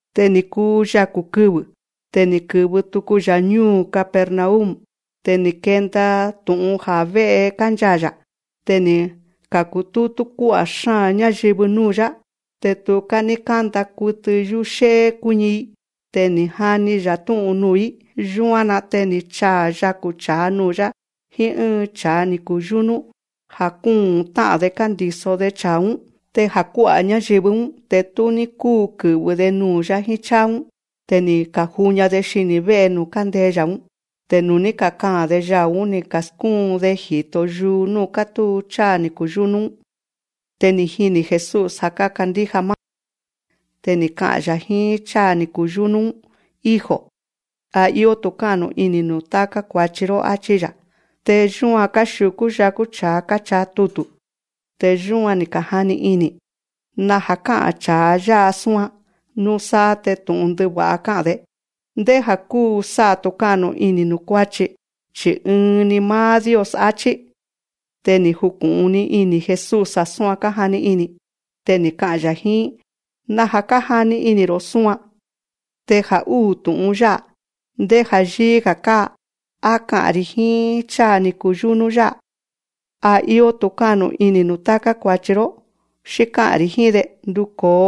Te ni̱ kuu yaku̱ kɨvɨ̱. Te ni̱ kɨ̱vɨ tuku‑ya̱ ñúu̱ Capernaum. Te ni̱ kenda tu̱'un ja̱ vé'e kánchaa̱‑ya̱. Te ni̱ ka̱kutútú kuá'a̱ xáa̱n ñáyɨvɨ núu̱‑yá. Te tuká ní kánda kutɨ yúxé'é kuíñi‑i. Te ni̱ jani‑ya̱ tú'un nuu̱‑í. Yúan‑na te ni̱ chaa̱ yaku̱ cha̱a nuu̱‑yá jíín ɨ́ɨn cha̱a ni̱ kuyúnú, ja̱ kúu̱n tá'a̱n‑de kándi̱so‑de cha̱a‑ún. Te ja̱ kuá'a̱ ñáyɨvɨ‑ún, te tú ní kúu kɨ̱vɨ‑de nuu̱‑yá jíín cháa‑ún. Te ni̱ ka̱juña‑de xini̱ vé'e nuu̱ kándee‑ya̱‑ún. Te nuu̱ ní kakaa̱n‑de yau̱‑ún, ni̱ ka̱skúun‑de ji̱to yuu núu̱ kátúu cháa ni̱ kuyúnú‑ún. Te ni̱ jini̱ Jesús ja̱ kákandíja máá‑de. Te ni̱ ka'a̱n‑ya̱ jíín cháa ni̱ kuyúnú‑ún: Hijo, a íó tu̱ká'nu ini̱ nuu̱ táká kua̱chi‑ró, áchí‑ya̱. Te yúan káxiu̱kú yakú cha̱a káchaa tutu̱. Te yu̱án, ni̱ ka̱jani ini̱: Naja̱ ká'a̱n cha̱a yá'a súan. Núsáá te tu̱'un ndɨva̱'a ká'a̱n‑de. Ndéja̱ kúu sá'a tu̱ká'nu ini̱ nuu̱ kuáchi, chi̱ ɨɨn‑ni máá Dios, áchí. Te ni̱ juku̱'un‑ni ini̱ Jesús ja̱ súan kájani ini̱. Te ni̱ ka'a̱n‑ya̱ jíín: Naja̱ kájani ini̱‑ro̱ súan. Te ja̱ úu̱ tu̱'un yá'a, ndéja̱ yíí‑ga̱ káa. Á ka'a̱n‑ri̱ jíín cháa ni̱ kuyúnú yá'a: A íó tu̱ká'nu ini̱ nuu̱ táká kua̱chi‑ró; xí ká'a̱n‑ri̱ jíín‑de: Nduko̱o,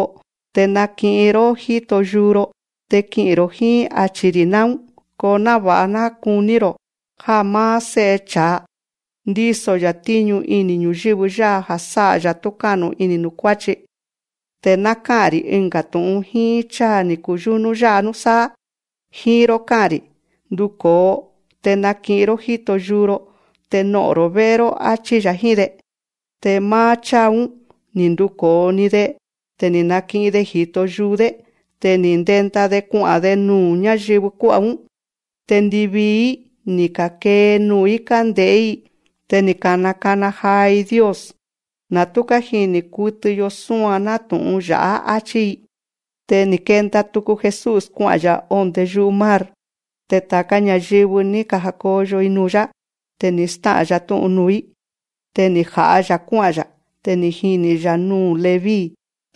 te naki'in‑ró jíto yuu‑ro, te ki'i̱n‑ro̱ jíín, achi̱‑ri̱ náún. Ko náva̱'a ná kuní‑ro̱ já máá Sé'e cha̱a, ndíso‑ya̱ tíñu ini̱ ñu̱yɨ́vɨ yá'a ja̱ sá'a‑ya̱ túká'nu ini̱ nuu̱ kuáchi, te ná ká'a̱n‑ri̱ ɨnga̱ tu̱'un jíín cháa ni̱ kuyúnú yá'a núsáá: Jíín‑ró ká'a̱n‑ri̱: Nduko̱o, te naki'in‑ró jíto yuu‑ro, te no'o̱n‑ro̱ vé'e‑ró, áchí‑ya̱ jíín‑de. Te máá cháa‑ún, ni̱ nduko̱o‑ni‑de. Te ni̱ naki'in‑de ji̱to yuu‑dé. Te ni̱ ndenda‑de kua'a̱n‑de nuu̱ ñáyɨvɨ kuá'a̱‑ún. Te ndivii‑í, ni̱ ka̱kee nuu̱‑í kánde̱'é‑i. Te ni̱ ka̱nakana jaa‑i Dios: Na̱ tú kájini̱ kutɨ‑yo súan nátu̱'un ya̱'á, áchí‑i. Te ni̱ kenda tuku Jesús kua'a̱n‑ya̱ ondé yu'u mar. Te ta̱ká ña̱yɨvɨ, ni̱ ja̱koyo‑i nuu̱‑yá. Te ni̱ stá'a̱n‑ya̱ tú'un nuu̱‑í. Te ni̱ ja̱'a‑ya̱ kuá'a̱n‑ya̱. Te ni̱ jini̱‑ya̱ núu̱ Leví,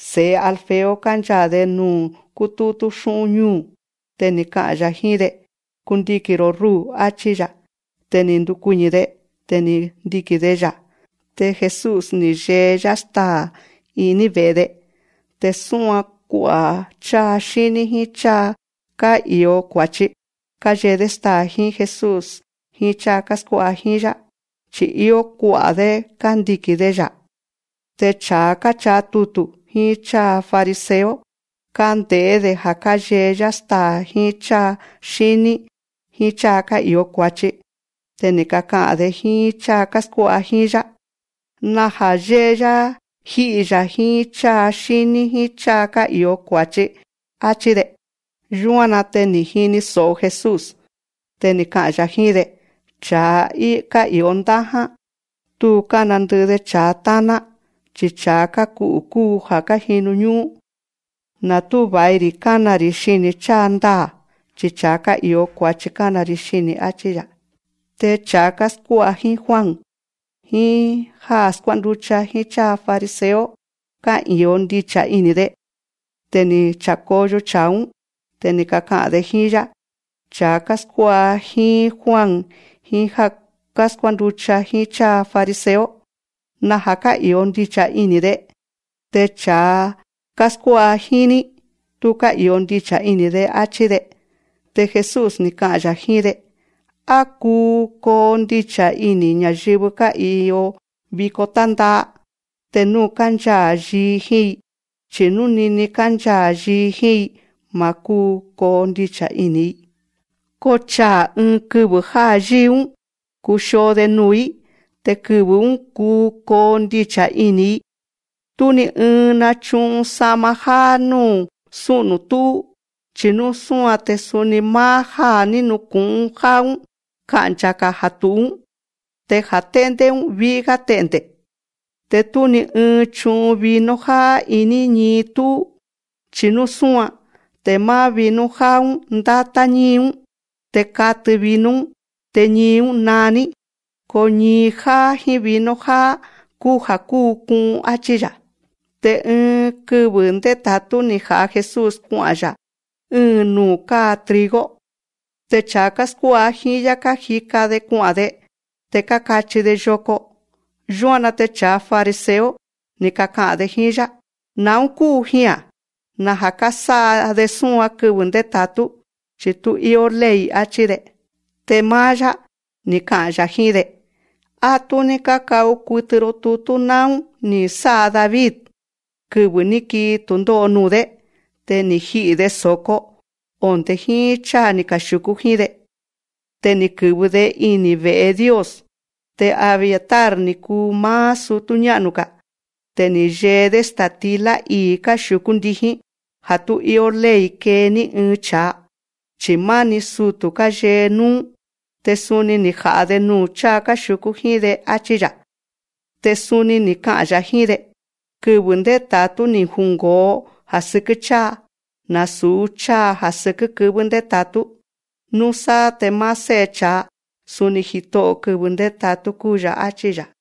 se̱'e Alfeo, kánchaa̱‑de nuu̱ kútútú xú'ún ñúu̱. Te ni̱ ka'a̱n‑ya̱ jíín‑de: Kundiki̱n‑ro̱ rúu̱, áchí‑ya̱. Te ni̱ ndukuiñi̱‑de. Te ni̱ ndiki̱n‑de‑ya̱. Te Jesús, ni̱ yee‑yá staa̱ iní ve̱'e‑de. Te suni kua'a̱ cháa xíní jíín cháa ká'i̱o kua̱chi, káyee‑dé staa̱ jíín Jesús jíín cháa káskuá'a jíín‑yá, chi̱ íó kua'a̱‑dé kándiki̱n‑de‑ya̱. Te cha̱a káchaa tutu̱, jíín cháa fariseo, kánde̱'é‑de ja̱ yée‑yá staa̱ jíín cháa xíní jíín cháa ká'i̱o kua̱chi. Te ni̱ kaka'a̱n‑de jíín cháa káskuá'a jíín‑yá: Naja̱ yée‑yá jí'i‑ya̱ jíín cháa xíní jíín cháa ká'i̱o kua̱chi, áchí‑de. Yúan‑na te ni̱ jini so̱'o Jesús. Te ni̱ ka'a̱n‑ya̱ jíín‑de: Cha̱a ká'i̱o ndáján, tú kánandɨ'ɨ‑de cha̱a táná, chi cha̱a káku'u̱ kúu ja̱ kájinu ñú'ún. Na̱ tú va̱i‑ri̱ kana‑ri̱ xini̱ cháa ndaa̱, chi cha̱a ká'i̱o kua̱chi kána‑ri̱ xini̱, áchí‑ya̱. Te cha̱a káskuá'a jíín Juan, jíín já káskuá'a jíín cháa fariseo, ká'i̱o ndicha̱ ini̱‑de. Te ni̱ cha̱koyo cha̱a‑ún. Te ni̱ kaka'a̱n‑de jíín‑yá: Cha̱a káskuá'a jíín Juan jíín já káskuá'a jíín cháa fariseo, naja̱ ká'i̱o ndicha̱ ini̱‑de, te cha̱a káskuá'a jíín‑ní, tú ká'i̱o ndicha̱ ini̱‑de, áchí‑de. Te Jesús, ni̱ ka'a̱n‑ya̱ jíín‑de: Á kuu kondicha̱ ini̱ ña̱yɨvɨ ká'i̱in viko tánda'a, te nú kánchaa̱ yii jíín‑i. Chi̱ nú nini kánchaa̱ yii jíín‑i, ma̱ kúu kondicha̱ ini̱‑i. Ko chaa̱ ɨɨn kɨvɨ̱ já yíi‑ún, kuxio‑de nuu̱‑í. Te kɨvɨ̱‑ún, kuu kondicha̱ ini̱‑i. Tú ni ɨɨn nachu'un sa'ma jáá núu̱ sú'nu̱ tu̱'ú. Chi̱ nú súan, te suni máá já ní nuku̱'un jáá‑ún ka'ncha̱‑ga̱ ja̱ tu̱'ú‑ún, te ja̱ te̱'ndé‑ún ví'í‑gá te'nde̱. Te tú ni ɨɨn chu'un vino jáá iní ñii tú'ú. Chi̱ nú súan, te máá vino jáá‑ún ndátá ñíi‑ún, te katɨ vino‑ún, te ñii‑ún naa‑ní. Ko ñii jáá jíín vino jáá, kúu ja̱ kúu ku'un, áchí‑ya̱. Te ɨɨn kɨvɨ̱ ndéta̱tú ni̱ ja̱'a Jesús kua'a̱n‑ya̱ ɨ́ɨn nuu̱ káa trigo. Te cha̱a káskuá'a jíín‑yá, kájika‑de kua'a̱n‑de. Te kákachi‑de yoko. Yúan‑na te cha̱a fariseo, ni̱ kaka'a̱n‑de jíín‑yá: Na̱ún kúu jia̱n. Naja̱ kásá'a‑de súan kɨvɨ̱ ndéta̱tú, chi̱ tú íó ley. Achí‑de. Te máá‑yá, ni̱ ka'a̱n‑yá jíín‑de: Á tú ní káka'u kutɨ‑ro tutú na̱ún ní sá'a David, kɨvɨ̱ ní kii tu̱ndó'o nuu̱‑dé. Te ni̱ ji'i̱‑de so̱ko, onde̱ jíín cháa ni̱ kaxiu̱kú jíín‑de. Te ni̱ kɨ̱vɨ‑de ini̱ ve̱'e Dios. Te Abiatar ni̱ kuu máá sutú ñá'nu‑ga̱. Te ni̱ yee‑dé sta̱tilá ii̱ káxiu̱kú ndijín, ja̱ tú íó ley kee ní ɨɨn cha̱a, chi̱ máni sutu̱ káyee núú. Te suni ni̱ ja̱'a‑de nuu̱ cháa káxiu̱kú jíín‑de, áchí‑ya̱. Te suni ni̱ ka'a̱n‑ya̱ jíín‑de: Kɨvɨ̱ ndéta̱tú ni̱ jungo̱o ja̱ sɨkɨ́ cháa; nasu̱ cháa ja̱ sɨkɨ́ kɨvɨ́ ndéta̱tú. Núsáá te máá Sé'e cha̱a, suni Jito'o̱ kɨvɨ̱ ndéta̱tú kúu‑ya̱, áchí‑ya̱.